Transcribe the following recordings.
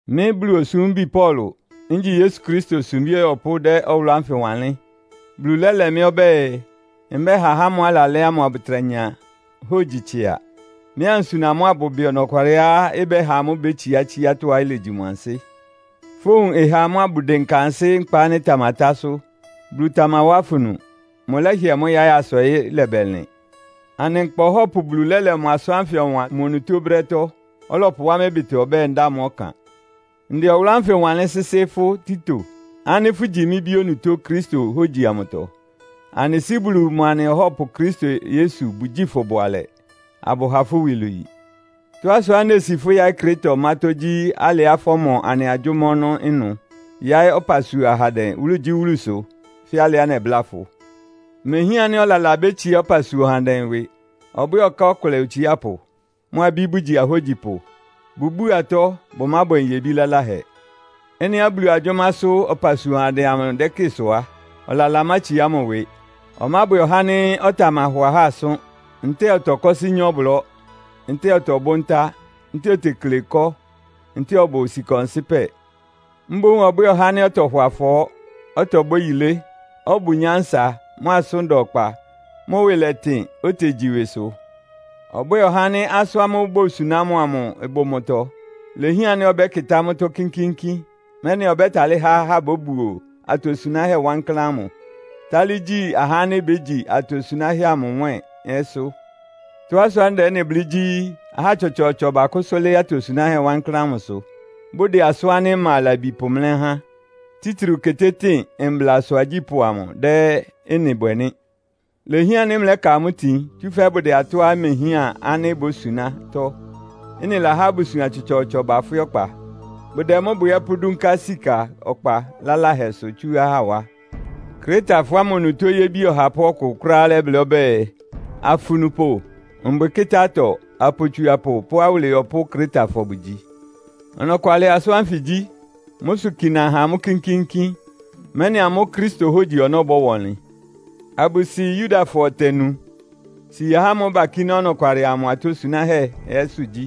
Mɩ́ Bulu osúmbi Paulo, ngyi Yesu Kristo sumbí ɔyɔpʋ́ dɛ́ ɔwʋlʋ́ ánfɩ wanlɩ́n. Bulu lɛ́lɛ mɩ́ ɔbɛ́ɛ, mbɛha ahá ámʋ́ʋ́ alalɛ́ ámʋ abʋtra nya hógyi tsɩa. Mɩ́ ansuna amʋ́ abʋbɩ ɔnɔkwalɩá ɩbɛ́ha amʋ́ bétsiá tsiátɔ́á ilegyi mʋ ansɩ́. Fówun ɩha amʋ́ abʋdɩnka ansɩ́ nkpa ánɩ́ ɩtamatásʋ́. Bulu tamawá afunu! Mʋlɛ́hɩɛ mʋ́ yáɩ́ asa ɔyɩ́ lɛbɛlɩn. Anɩ Nkpa Ɔhɔ́pʋ Bulu lɛ́lɛ mʋ asʋ́n ánfɩ ɔwan mʋ onutó brɛ́tɔ́, ɔlɔpʋwá mɩ́ ɩbɩtɔ ɔbɛ́ɛ, ndáa mʋ́ ɔkan. Ndɛ ɔwʋlʋ́ ánfɩ wanlɩ́n sɩ́sɩ́ fʋ́ Tito, ánɩ́ fʋ́gyi mɩ́ bí onutó Kristo hógyi amʋtɔ. Anɩ Sɩ́ Bulu mʋa anɩ Ɔhɔ́pʋ Kristo Yesu bʋgyíi fʋ bʋalɛ, abʋha fʋ́ iwilwii! Tɔ́á sʋá nesi fʋ́ yáɩ́ Kreta ɔmátɔ́ gyí alɩá fɔ́mɔ anɩ agyʋ́má ɔnɔ́ ɩnʋ, yáɩ́ ɔpasua ahandɛ wúlugyíwúlusʋ fɛ́ alɩá nɛbláa fʋ. Imehián ánɩ́ ɔlala bétsiá ɔpasua ɔhandɛ ɩwɩ. Ɔbwɛ́ɛ ɔká ɔkʋlɛ otsiápʋ, mʋ abí bʋgyi ahógyipʋ. Bʋbúu atɔ́; bʋmábwɛ nyebí laláhɛ. Ɩ́nɩá Bulu agyʋ́másʋ́ ɔpasua ɔhandɛ amʋ dɛ́kɩ sʋ á, ɔlala mátsiá mʋ ɩwɩ. Ɔmábwɛ ɔhá ánɩ́ ɔtamahɔ ahá asʋ́n, ntɛ́ɛ ɔtɔkɔ́sɩ́ nyá ɔblɔ́, ntɛ́ɛ ɔtɔbʋ́ ntá, ntɛ́ɛ otekle ɩkɔ́ ntɛ́ɛ ɔbʋ sika ɔnsɩ́pɛ. Mboún ɔbwɛ́ɛ ɔhá ánɩ́ ɔtɔhɔ afɔɔ́, ɔtɔbwɛ́ yilé, ɔbʋ nyánsa, mʋ asʋ́n da ɔkpa, mʋ ɩwɩ lɛtɩn, otegyi ɩwɩsʋ. Ɔbwɛ́ɛ ɔhá ánɩ́ asʋ́n ámʋ́ʋ́ bosuná mʋ amʋ ɩbʋ mʋ́tɔ́. Ilehián ánɩ́ ɔbɛ́kɩtá mʋ́tɔ́ kínkíínkín, mɛ́nɩ ɔbɛ́talɩ́ há ahá bóbuo atosunáhɛ́ wankláán ámʋ, tálɩ́ gyi ahá ánɩ́ bégyi atosunáhɛ́ amʋ nwɛ́ɛn ɛ́sʋ́. Tɔ́á sʋá ndɛ ɩ́nɩ blɩ́ gyí, ahá tsɔtsɔɔtsɔ bakʋ́sʋ́ lɩ́ɩ́ atosunáhɛ́ wankláán ámʋsʋ, bʋdɛ asʋ́n ánɩ́ ɩma labi pʋmlɛ́ ahá. Títriu ketétɩ́ɩn mblasʋ agyípʋ́ amʋ dɛ́ ɩ́nɩ bwɛ nɩ́. Ilehián ánɩ́ mlɛ́ka amʋ́ itin, tsúfɛ́ bʋdɛ atɔ́á imehián ánɩ́ bosunátɔ́. Ɩ́nɩ lahá abusuan tsɔtsɔɔtsɔ bafwɩ́ ɔkpa. Bʋdɛ mʋ́ bwɛ ɛ́ pʋ́dúnká sika ɔkpa laláhɛsʋ tsú ahá wá. Kretafɔ ámʋ onutó yébi ɔhapʋ́ ɔkʋ kʋ́ráá lɛ́blɩ́ ɔbɛ́ɛ, “Afunupʋ, mbwɩkɩ́tá-atɔ, apotsuapʋ pʋ́ awʋlɩyɔpʋ́ Kretafɔ bʋgyi.” Ɔnɔkwalɩ asʋ́n ánfɩ gyí. Mʋ́ sʋ kina ha amʋ́ kínkíínkín, mɛ́nɩ amʋ́ Kristo hógyi ɔnɔ́ bɔ́wa ɔnlɩn. Abʋsi Yudafɔ ɔtɛ nu, si ahá ámʋ́ʋ́ bakíná ɔnɔkwalɩ amʋ atosunáhɛ́ ɛ́sʋ́ gyí.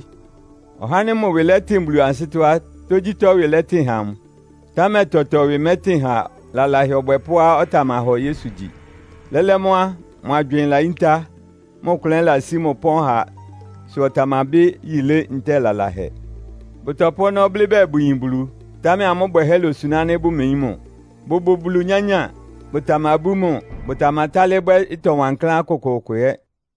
Ɔhá ánɩ́ mʋ ɩwɩ lɛ́tɩn Bulu ansɩ́tɔ́ á, tógyítɔ́ ɩwɩ lɛ́tɩn ha mʋ. Támɛ tɔtɔ ɩwɩ mɛ́tɩn ha lalahɛ ɔbwɛpʋ́á ɔtamahɔ Yesu gyi. Lɛ́lɛ́ mʋ́ á, mʋ agywɩɩn layíntá, mʋ klʋn ɛ́ ɩlasí mʋ ɩpɔ́n ha sʋ ɔtamabɩ́ yilé ntɛ́ɛ lalahɛ. Bʋtɔpʋ́ ɔnɔ́ blɩ́ bɛɛ bʋyin Bulu, támɛ amʋ́ bwɛhɛ́ losuná ánɩ́ bʋmeyín mʋ. Bʋbʋ Bulu nyányáa, bʋtamabú mʋ, bʋtamatálɩ́ bwɛ́ ɩtɔ wankláán kʋkʋʋkʋ ɛ́.